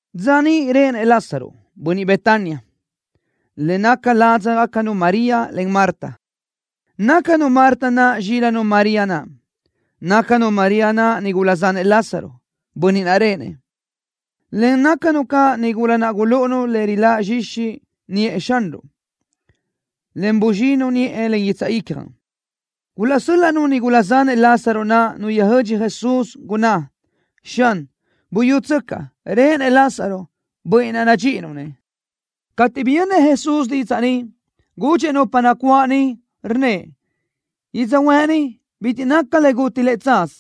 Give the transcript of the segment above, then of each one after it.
Dza niʼ réʼenëʼ Lázaro, bönniʼ Betania, le naca ládzagacanu María, en Marta. Nácanu Marta naʼ zxílanu María naʼ. Nácanu María naʼ nigula zanëʼ Lázaro, bönniʼ naʼ réʼenëʼ, en nácanu caʼ nigula naʼ gulúʼunu le riláʼ zxixi niʼë Xanruʼ, en buzxinu niʼë len guitsaʼ ícjanu. Gulaʼsö́l-laʼnu nigula zanëʼ Lázaro naʼ nu yöjö́dx Jesús, gunná: —Xan, buyútsöcaʼ, réʼenëʼ Lázaro, bönniʼ naʼ nadxíʼinuʼ-nëʼ. Cateʼ biyönnëʼ Jesús didzaʼ ni, gudxëʼ nupa nacuáʼ niʼ, rnnëʼ: —Yödzöhuë́ʼ ni bitiʼ naca le guti lëʼ tsaz,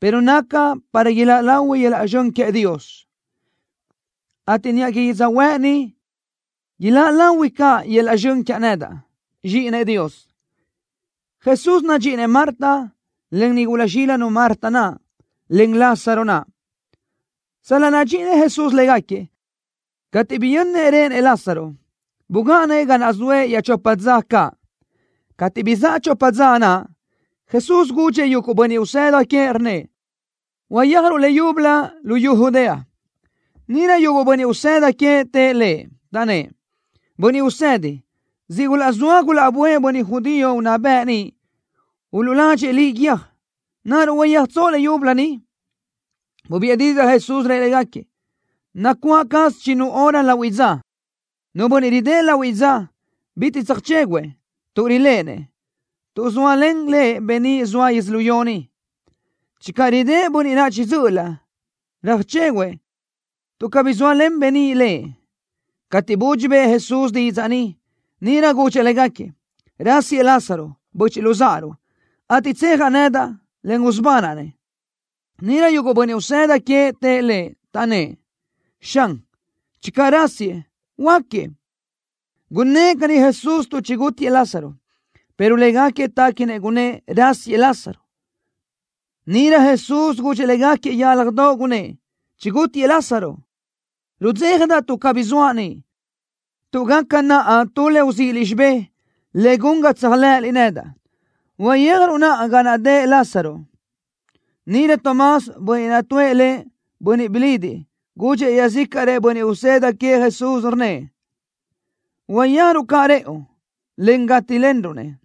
pero naca para iláʼ lahui yöl-laʼ zxön queëʼ Dios, ateʼ niʼa que yödzöhuë́ʼ ni iláʼ lahui caʼ yöl-laʼ zxön quiaʼ nedaʼ, Zxíʼinëʼ Dios. Jesús nadxíʼinëʼ Marta, en nigula zxílanu Marta naʼ, en Lázaro naʼ. Sal-laʼ nadxíʼinëʼ Jesús légaquiëʼ, cateʼ biyönnëʼ réʼenëʼ Lázaro, bugáʼanëʼ ga naʼ zoëʼ iaʼchopa dza caʼ. Cateʼ bizáʼa chopa dza naʼ, Jesús gudxëʼ yuguʼ bönniʼ usëda queëʼ, rnnëʼ: —Uyéajruʼ leyúbölö luyú Judea. Níʼirö yuguʼ bönniʼ usëda queëʼ tëʼ Lëʼ, taʼnnë́ʼ: —Bönniʼ Usedi, siʼ gulaʼzóa gulaʼböʼë bönniʼ judío unná bëʼ niʼ uluʼladxëʼ Liʼ guiö́j. ¿Naruʼ uyéajtsoʼ leyúbölö niʼ? Bubiʼë didzaʼ Jesús, rëʼ légaquiëʼ: —Nacuáʼ caz chinnu hora lahuiʼ dza. Nu bönniʼ ridë́ʼ lahuiʼ dza, bitiʼ tsöjchéguʼë, tuʼ riléʼenëʼ, tuʼ zóalen lëʼ beníʼ zoa yödzölió ni. Channö ridë́ʼ bönniʼ naʼ chiʼi dzö́ʼölö, röjchéguʼë, tuʼ cabí zóalen beníʼ lëʼ. Cateʼ budxi bëʼë Jesús didzaʼ ni, níʼirö gudxëʼ légaquiëʼ: —Rásiëʼ Lázaro, böchiʼ luzáʼaruʼ, ateʼ tsejaʼ nedaʼ, en usubanaʼ-nëʼ. Níʼirö yuguʼ bönniʼ usëda queëʼ tëʼ Lëʼ, taʼnnë́ʼ: —Xan, channö rásiëʼ, huöáquiëʼ. Gunnë́ʼ caní Jesús tuʼ chigútiëʼ Lázaro, pero légaquiëʼ téquinëʼ gunnë́ʼ: Rásisëʼ Lázaro. Níʼirö Jesús gudxëʼ légaquiëʼ yálajdoʼ, gunnë́ʼ: —Chigútiëʼ Lázaro. Rudzéjadaʼ tuʼ cabí zoaʼ niʼ, tuʼ gaca naʼa tu le uzíʼiliʼ xibé, le gun ga tséajlëʼëliʼ nedaʼ. Uyéajruʼ naʼa ga naʼ dëʼ Lázaro. Níʼirö Tomás, bönniʼ naʼ tuʼë lëʼ, Bönniʼ Bilidiʼ gudxëʼ iaʼzícaʼrëʼ bönniʼ usëda queëʼ Jesús, rnnëʼ: —Uyéajruʼ caʼ rëʼu, en gátilenruʼ-nëʼ.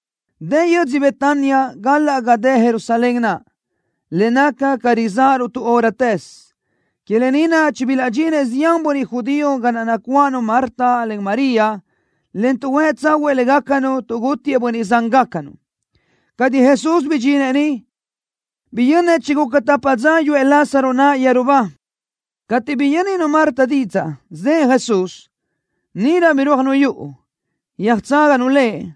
Dë yödzö Betania gálaʼsö ga dë Jerusalén naʼ, le naca ca rizáʼaruʼ tu hóratëz. Que lë ni naʼ chibilaʼdxinëʼ zián bönniʼ judío ga naʼ nacuáʼanu Marta, en María, en tuʼhuë́ tsáhuëʼë légacanu tuʼ gútiëʼ bönniʼ zángacanu. Cateʼ Jesús bidxinëʼ niʼ, biyönnëʼ chiguca tapa dza yuʼë Lázaro naʼ yeru ba. Cateʼ biyö́ninu Marta didzaʼ zëʼë Jesús, níʼirö birúajnu yuʼu, yöjtságanu Lëʼ,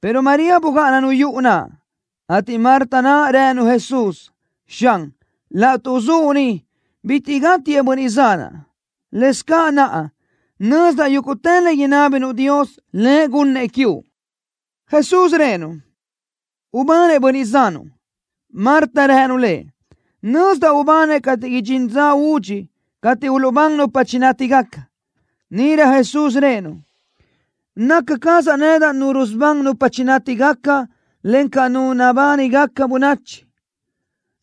pero María bugáʼananu yuʼu naʼ. Marta naʼ rënu Jesús: —Xan, laʼtuʼ zuʼ ni, bitiʼ gátiëʼ bönniʼ zanaʼ. Lëscaʼ naʼa, nözdaʼ yúguʼtë le inábinuʼ Dios, Lëʼ gunnëʼ quiuʼ. Jesús rëʼë-nu: —Ubanëʼ bönniʼ zanuʼ. Marta rënu Lëʼ: —Nözdaʼ ubanëʼ cateʼ idxín dza údxi cateʼ uluʼbán nupa chinátigaca. Níʼirö Jesús rëʼë-nu: —Naca cazaʼ nedaʼ Nu rusubán nupa chinátigaca, encaʼ Nu nabánigaca bönachi.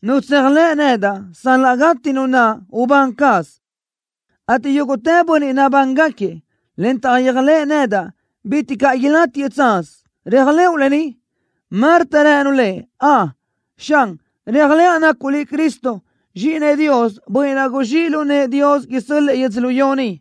Nu tséajlëʼ nedaʼ, sal-laʼ gati nu naʼ, ubán caz, ateʼ yúguʼtë bönniʼ nabángaquiëʼ, en taʼyéajlëʼë nedaʼ, bitiʼ caʼ ilátiëʼ tsaz. ¿Réajlëʼu lë ni? Marta rënu Lëʼ: —Ön, Xan. Réajlëʼa nacuʼ Liʼ Cristo, Zxíʼinëʼ Dios, Bönniʼ naʼ guzxíʼ lu nëʼë Dios isö́l-lëʼë yödzölió ni.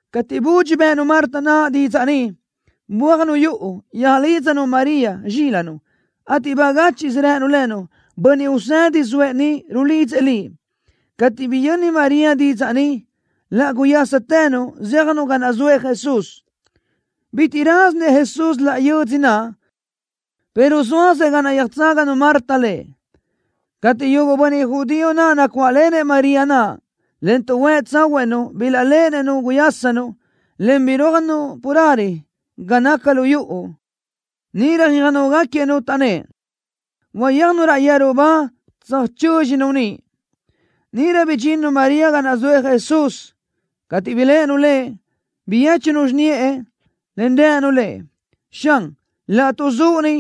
Cateʼ budxi bë́ʼënu Marta naʼ didzaʼ ni, bö́ajnu yuʼu, yöjlídzanu María, zxílanu, ateʼ bagáchiʼsö rënu lënu: —Bönniʼ Usedi zoëʼ ni, rulidzëʼ liʼ. Cateʼ biyö́ninu María didzaʼ ni, laʼ guyástënu, zéajnu ga naʼ zoëʼ Jesús. Bitiʼ rázinëʼ Jesús laʼ yö́dzödoʼ naʼ, pero zóasëʼ ga naʼ yöjtságanu Marta Lëʼ. Cateʼ yuguʼ bönniʼ judío naʼ nacuáʼlenëʼ María naʼ, en tuʼhuë́ tsáhuëʼë-nu bilaʼléʼenëʼ-nu guyásanu, en birúajnu carelö ga naca lu yuʼu, níʼirö yöjnógaquiëʼ-nu, taʼnnë́ʼ: —Uyéajnu raʼ yeru ba tsöjchö́dxinu niʼ. Níʼirö bidxinnu María ga naʼ zoëʼ Jesús. Cateʼ biléʼenu Lëʼ, biyéchunu xiniʼë, en rënu Lëʼ: —Xan, laʼtuʼ zuʼ ni,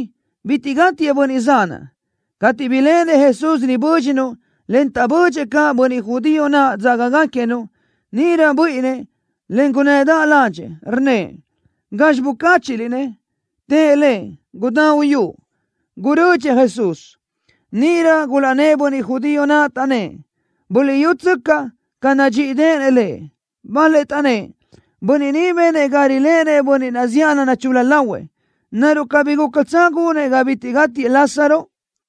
bitiʼ gátiëʼ bönniʼ zanaʼ. Cateʼ biléʼenëʼ Jesús ribö́dxinu, en taʼbödxëʼ caʼ bönniʼ judío naʼ dzágagaquiëʼ-nu, níʼirö buíʼinnëʼ, en gunnëdaʼ ládxëʼë. Rnnëʼ: —¿Gazxi bucáchiʼliʼ-nëʼ? Tëʼ Lëʼ: —Gudá uyúʼ. Gurödxëʼ Jesús. Níʼirö gulaʼnnë́ʼ bönniʼ judío naʼ, taʼnnë́ʼ: —Buliʼyútsöcaʼ ca nadxíʼideʼenëʼ lëʼ. Bal-lëʼ taʼnnë́ʼ: —Bönniʼ ni benëʼ ga riléʼenëʼ bönniʼ naʼ zíʼalö nachul-la lahuëʼ. ¿Naruʼ cabí gúcatsö gunëʼ ga bitiʼ gátiëʼ Lázaro?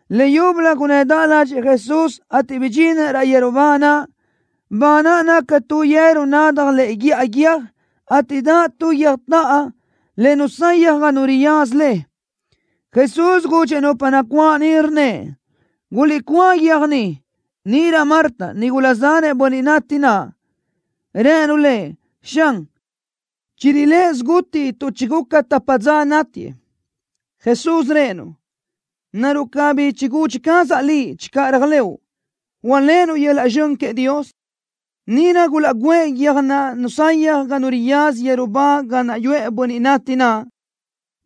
Leyúbölö gunnëdaʼ ládxëʼë Jesús, ateʼ bidxinëʼ raʼ yeru ba naʼ. Ba naʼ naca tu yeru nadaj lëʼe guíʼa guiö́j, ateʼ daʼ tu guiö́jtaʼa le nusayaj ga nu riyaza le. Jesús gudxëʼ nupa nacuáʼ niʼ, rnnëʼ: —Guliʼcúa guiö́j ni. Níʼirö Marta, nigula zanëʼ bönniʼ nati naʼ, rënu Lëʼ: —Xan, chirilë́ʼë siguti tuʼ chiguca tapa dza nátiëʼ. Jesús rëʼë-nu: —¿Naruʼ cabí chigudxi cazaʼ liʼ channö réajlëʼu, hualéʼenuʼ yöl-laʼ zxön queëʼ Dios? Níʼirö gulaʼgǘëʼ guiö́jtaʼa naʼ nusayaj ga nu riyaza yeru ba ga naʼ yuʼë bönniʼ nati naʼ.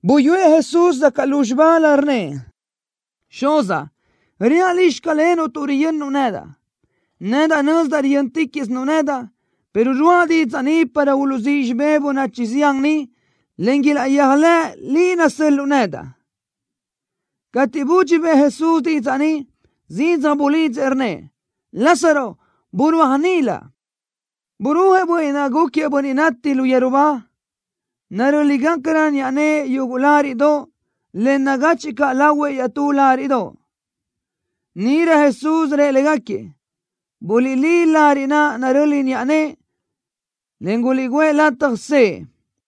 Buyúëʼ Jesús zacaʼ lúzxibalö, rnnëʼ: —Xuzaʼ, reaʼ Liʼ, xclenuʼ tuʼ riyönnuʼ nedaʼ. Nedaʼ nözdaʼ riyö́ntiquiʼsinuʼ nedaʼ, pero ruáʼa didzaʼ ni para uluʼzíʼ xibé bönachi zián ni, en ilaʼyéajlëʼ Liʼ naʼ nasö́l-luʼu nedaʼ. Cateʼ budxi bëʼë Jesús didzaʼ ni, zidzaj bulidzëʼ, rnnëʼ: —Lázaro, burúaj nilö. Burúajëʼ bönniʼ naʼ gúquiëʼ bönniʼ nati lu yeru ba, narö́ligacarö niʼa nëʼë yuguʼ láriʼdoʼ, en nagachiʼ caʼ lahuëʼ iaʼtú láriʼdoʼ. Níʼirö Jesús rëʼ légaquiëʼ: —Buliʼlí lariʼ naʼ naröli niʼa nëʼë, en guliʼguʼë lataj sëʼë.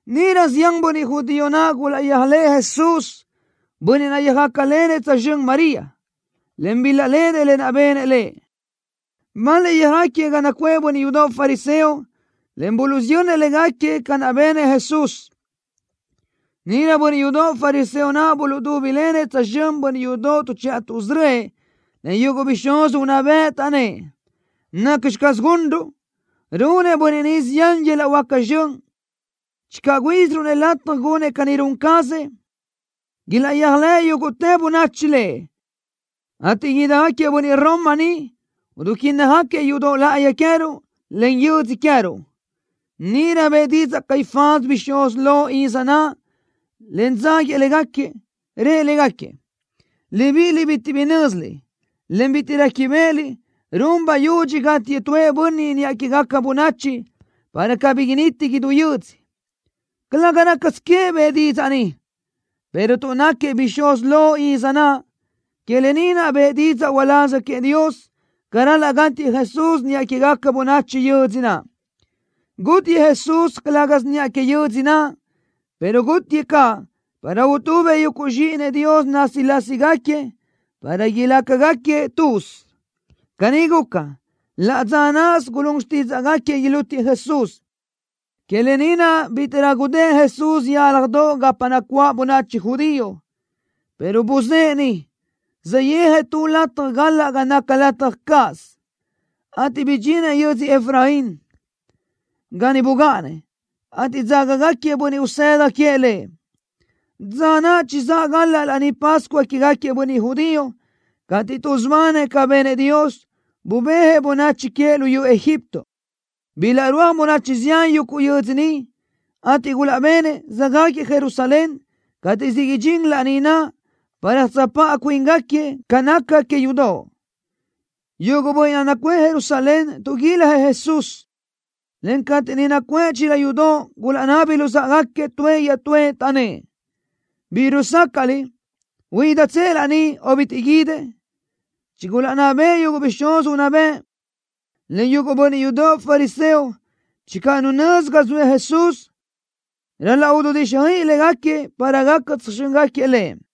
Níʼirö zián bönniʼ judío naʼ gulaʼyéajlëʼë Jesús, bönniʼ naʼ yöjácalenëʼ tsözxö́n María, en bilaʼléʼenëʼ lë naʼ benëʼ Lëʼ. Bal-lëʼ yöjáquiëʼ ga nacuʼë bönniʼ yudoʼ fariseo, en buluʼsiyönnëʼ légaquiëʼ ca naʼ benëʼ Jesús. Níʼirö bönniʼ yudoʼ fariseo naʼ buluʼdúbilenëʼ tsözxö́n bönniʼ yudoʼ tuʼchiʼa tuʼsörö́ëʼ, en yuguʼ bixúz unná bëʼ, taʼnnë́ʼ: —¿Nacxi caz gunruʼ? Runëʼ bönniʼ ni zián yöl-laʼ huáca zxön. Channö güíʼisiruʼ-nëʼ lataj gunëʼ ca ni run cazëʼ, ilaʼyéajlëʼ yúguʼtë bönachi Lëʼ, ateʼ idijáquiëʼ bönniʼ Roma ni, duquínnajgaquiëʼ yudoʼ láʼayi queë́ruʼ, en yödzö queë́ruʼ. Níʼirö bëʼë didzaʼ Caifás, bixúz lo iz naʼ, en dzáguiëʼ légaquiëʼ, rëʼ légaquiëʼ: —Libíʼiliʼ bitiʼ bi nö́ziliʼ, en bitiʼ réquibeʼeliʼ run bayudxi gátiëʼ tuëʼ bönniʼ niʼa quégaca bönachi, para cabí initi idú yödzö. Calëga rácasö queëʼ bëʼë didzaʼ ni, pero tuʼ náquiëʼ bixúz lo iz naʼ, que lë ni naʼ bëʼë didzaʼ uláz queëʼ Dios ca ral-laʼ gátiëʼ Jesús niʼa quégaca bönachi yödzö naʼ. Gátiëʼ Jesús, calë́gasö niʼa que yödzö naʼ, pero gátiëʼ caʼ para utubëʼ yuguʼ zxíʼinëʼ Dios násilasigaquiëʼ, para ilácagaquiëʼ tuz. Caní guca, laʼ dza náʼasö gulún xtídzaʼgaquiëʼ ilútiëʼ Jesús. Que lë ni naʼ bítiʼrö gudë́ʼ Jesús yálajdoʼ gapa nacuáʼ bönachi judío, pero buzë́ʼë niʼ, saʼyéajëʼ tu lataj galaʼ ga naca lataj cáʼasö, ateʼ bidxinëʼ yödzö Efraín, ga niʼ bugáʼanëʼ, ateʼ dzágagaquiëʼ bönniʼ usëda queëʼ Lëʼ. Dza naʼ chizáʼ galaʼ Laní Pascua quégaquiëʼ bönniʼ judío cateʼ tuʼsubanëʼ ca benëʼ Dios, bubéajëʼ bönachi queëʼ luyú Egipto. Bilaʼrúaj bönachi zián yuguʼ yödzö niʼ, ateʼ gulaʼbenëʼ, söjáquiëʼ Jerusalén cateʼ siʼ idxín laní naʼ para tsöjpáʼa cuíngaquiëʼ ca naca que yudoʼ. Yuguʼ bönniʼ naʼ nacuʼë Jerusalén tuʼguiljëʼ Jesús, en cateʼ niʼ nacuʼë chila yudoʼ, gulaʼnabi luzáʼagaquiëʼ tuëʼ iaʼtúëʼ, taʼnnë́ʼ: —¿Bizxi rusácaʼliʼ? ¿Huídatsëʼ laní, o bitiʼ guídëʼ? Chigulaʼnná bëʼë yuguʼ bixúz unná bëʼ, en yuguʼ bönniʼ yudoʼ fariseo channö nu nözi ga zoëʼ Jesús, ral-laʼ ududíxjöiʼi légaquiëʼ para gaca tsöjxö́ngaquiëʼ Lëʼ.